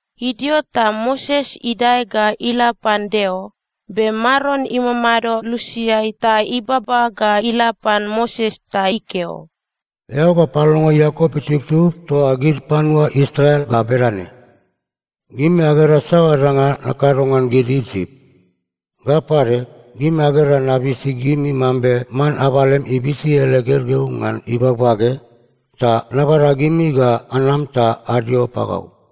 Idio ta Moses idae ga ila pan Deo. Be Maron imamado lusiai ta ibaba ga ila pan Moses ta ikeo, “Eao ga palongo Iakop itubtub toa gid panua Israel ga bedane, ‘Gimi agera saoa danga nakado ngan gid Isip. Ga pade gimi agera nabisi gimi mambe man abalem ibisi ele gergeu ngan ibagbage, ta nabada gimi ga anam ta adio pagau.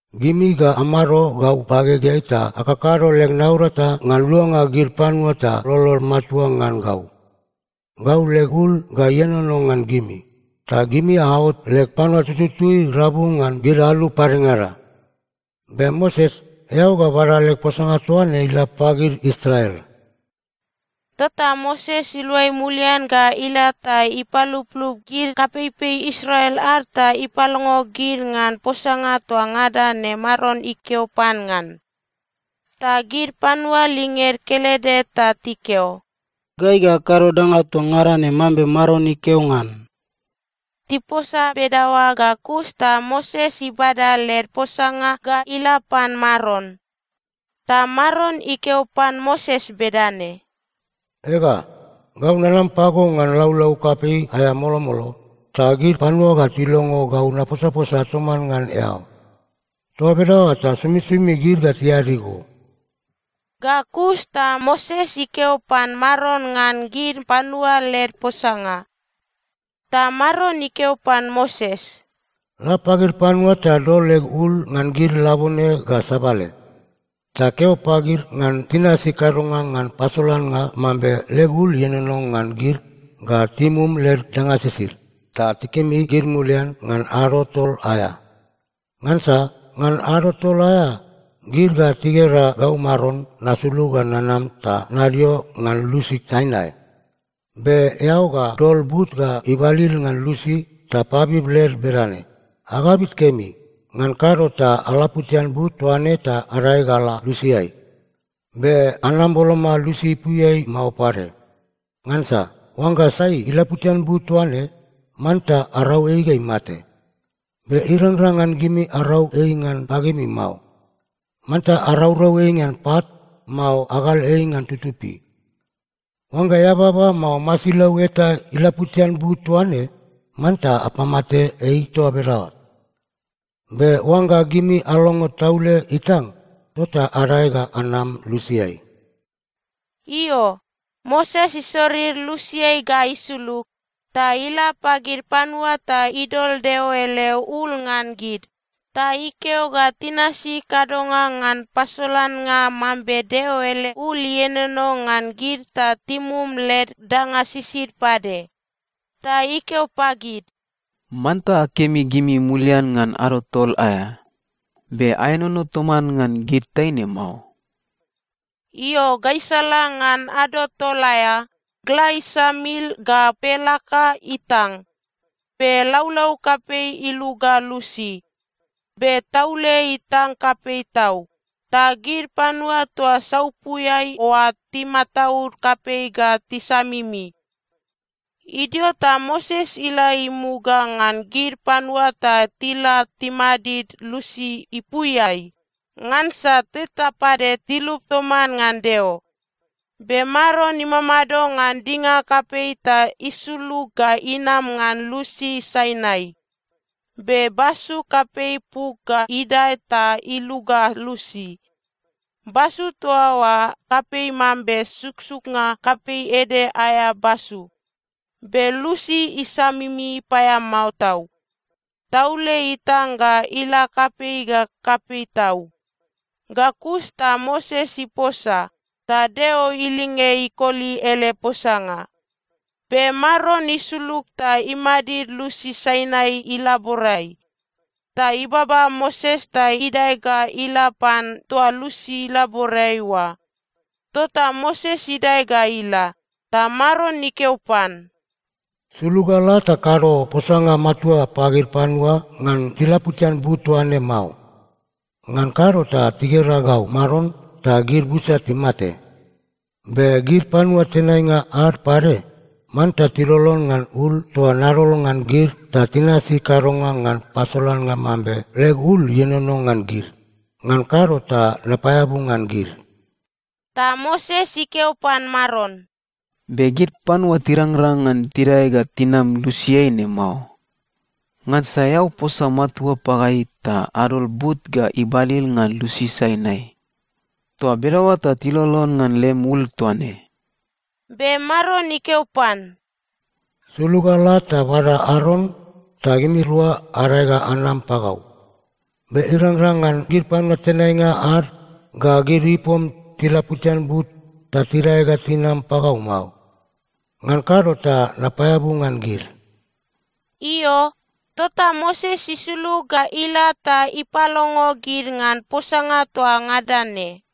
Gimi ga amado gau bagegeai ta akakado leg naurata ngan luanga gid panua ta lolod matua ngan gau. Gau leg ul ga ienono ngan gimi, ta gimi aot leg panua tututui rabu ngan gid alu padengada.’ Be Moses, eao ga bada leg posanga toa ne ga ila pagid Israel.” Tota Moses iluai mulian ga ila ta ipaluplup gid kapeipei Israel ad ta ipalongo gid ngan posanga toa ngada ne Maron ikeo pan ngan. Ta gid panua linged kelede ta tikeo, “Gai ga akado danga toa ngada ne mambe Maron ikeo ngan.” Tiposa bedaoa ga kus ta Moses ibada led posanga ga ila pan Maron. Ta Maron ikeo pan Moses bedane, “Ega, gau ga nanam pago ngan laulau kapei aea molomolo, ta gid panua ga tilongo gau naposaposa toman ngan eao. Toa bedaoa ta somisomi gid ga tiadi go.” Ga kus ta Moses ikeo pan Maron ngan gid panua led posanga. Ta Maron ikeo pan Moses, “La pagid panua ta dol leg ul ngan gid labone ga sabale. Ta keo pagid ngan tinasi kadonga ngan pasolannga mambe leg ul ienono ngan gid ga timum led danga sisid, ta tikemi gid mulian ngan ado tol aea. Ngansa ngan ado tol aea, gid ga tigera gau Maron nasulug ga nanam ta nadio ngan lusi Sainai. Be eao ga dol but ga ibalil ngan lusi ta pabib led bedane, ‘Agabit kemi. Ngan kado ta alaputian but toa ne ta adae ga ala lusiai. Be anam boloma lusi ipuiai mao pade. Ngansa oangga sai ilaputian but toa ne, manta arau ei ga imate. Be irangrang ngan gimi arau ei ngan bagemi mao. Manta araurau ei ngan pat, mao agal ei ngan tutupi. Oangga eababa mao masilau eta ilaputian but toa ne, manta apamate ei toa bedaoa. Be oangga gimi alongo taule itang, tota adae ga anam lusiai.’” Io, Moses isorir lusiai ga isulug, ta ila pagid panua ta idol Deo ele ul ngan gid, ta ikeo ga tinasi kadonga ngan pasolannga mambe Deo ele ul ienono ngan gid ta timum led danga sisid pade. Ta ikeo pagid, “Manta akemi gimi mulian ngan ado tol aea. Be aenono toman ngan gid taine mao.” Io, gaisala ngan ado tol aea, gla isamil ga pelaka itang, be laulau kapei iluga lusi. Be taule itang kapei tau, ta gid panua toa saupuiai oa timataud kapei ga tisamimi. Idio ta Moses ila imuga ngan gid panua ta tila timadid lusi ipuiai, ngansa teta pade tilup toman ngan Deo. Be Maron imamado ngan dinga kapei ta isulug ga inam ngan lusi Sainai, be basu kapei puk ga idae ta iluga lusi. Basu toa oa kapei mambe suksuknga kapei ede aea basu. Be lusi isamimi paeamao tau. Taule itang ga ila kapei ga kapei tau. Ga kus ta Moses iposa, ta Deo ilinge ikoli ele posanga. Be Maron isulug ta imadid lusi Sainai ilaborai. Ta ibaba Moses ta idae ga ila pan toa lusi ilaborai oa. Tota Moses idae ga ila, ta Maron ikeo pan, “Sulug ga la ta kado posanga matua pagid panua ngan tilaputian but toaine mao. Ngan kado ta tigera gau Maron ta gid busa timate. Be gid panua tenainga ad pade, manta tilolon ngan ul toa nadol ngan gid ta tinasi kadonga ngan pasolannga mambe leg ul ienono ngan gid. Ngan kado ta napaeabu ngan gid.” Ta Moses ikeo pan Maron, “Be gid panua tirangrang ngan tidae ga tinam lusiai ne mao. Ngansa eao posa matua pagai ta adol but ga ibalil ngan lusi Sainai. Toa bedaoa ta tilolon ngan lem ul toa ne.” Be Maron ikeo pan, “Sulug ga la ta bada Aron ta gimirua adae ga anam pagau. Be irangrang ngan gid panua tenainga ad ga gid ipom tilaputian but ta tidae ga tinam pagau mao. Ngan kado ta napaeabu ngan gid.” Io, tota Moses isulug ga ila ta ipalongo gid ngan posanga toa ngada ne.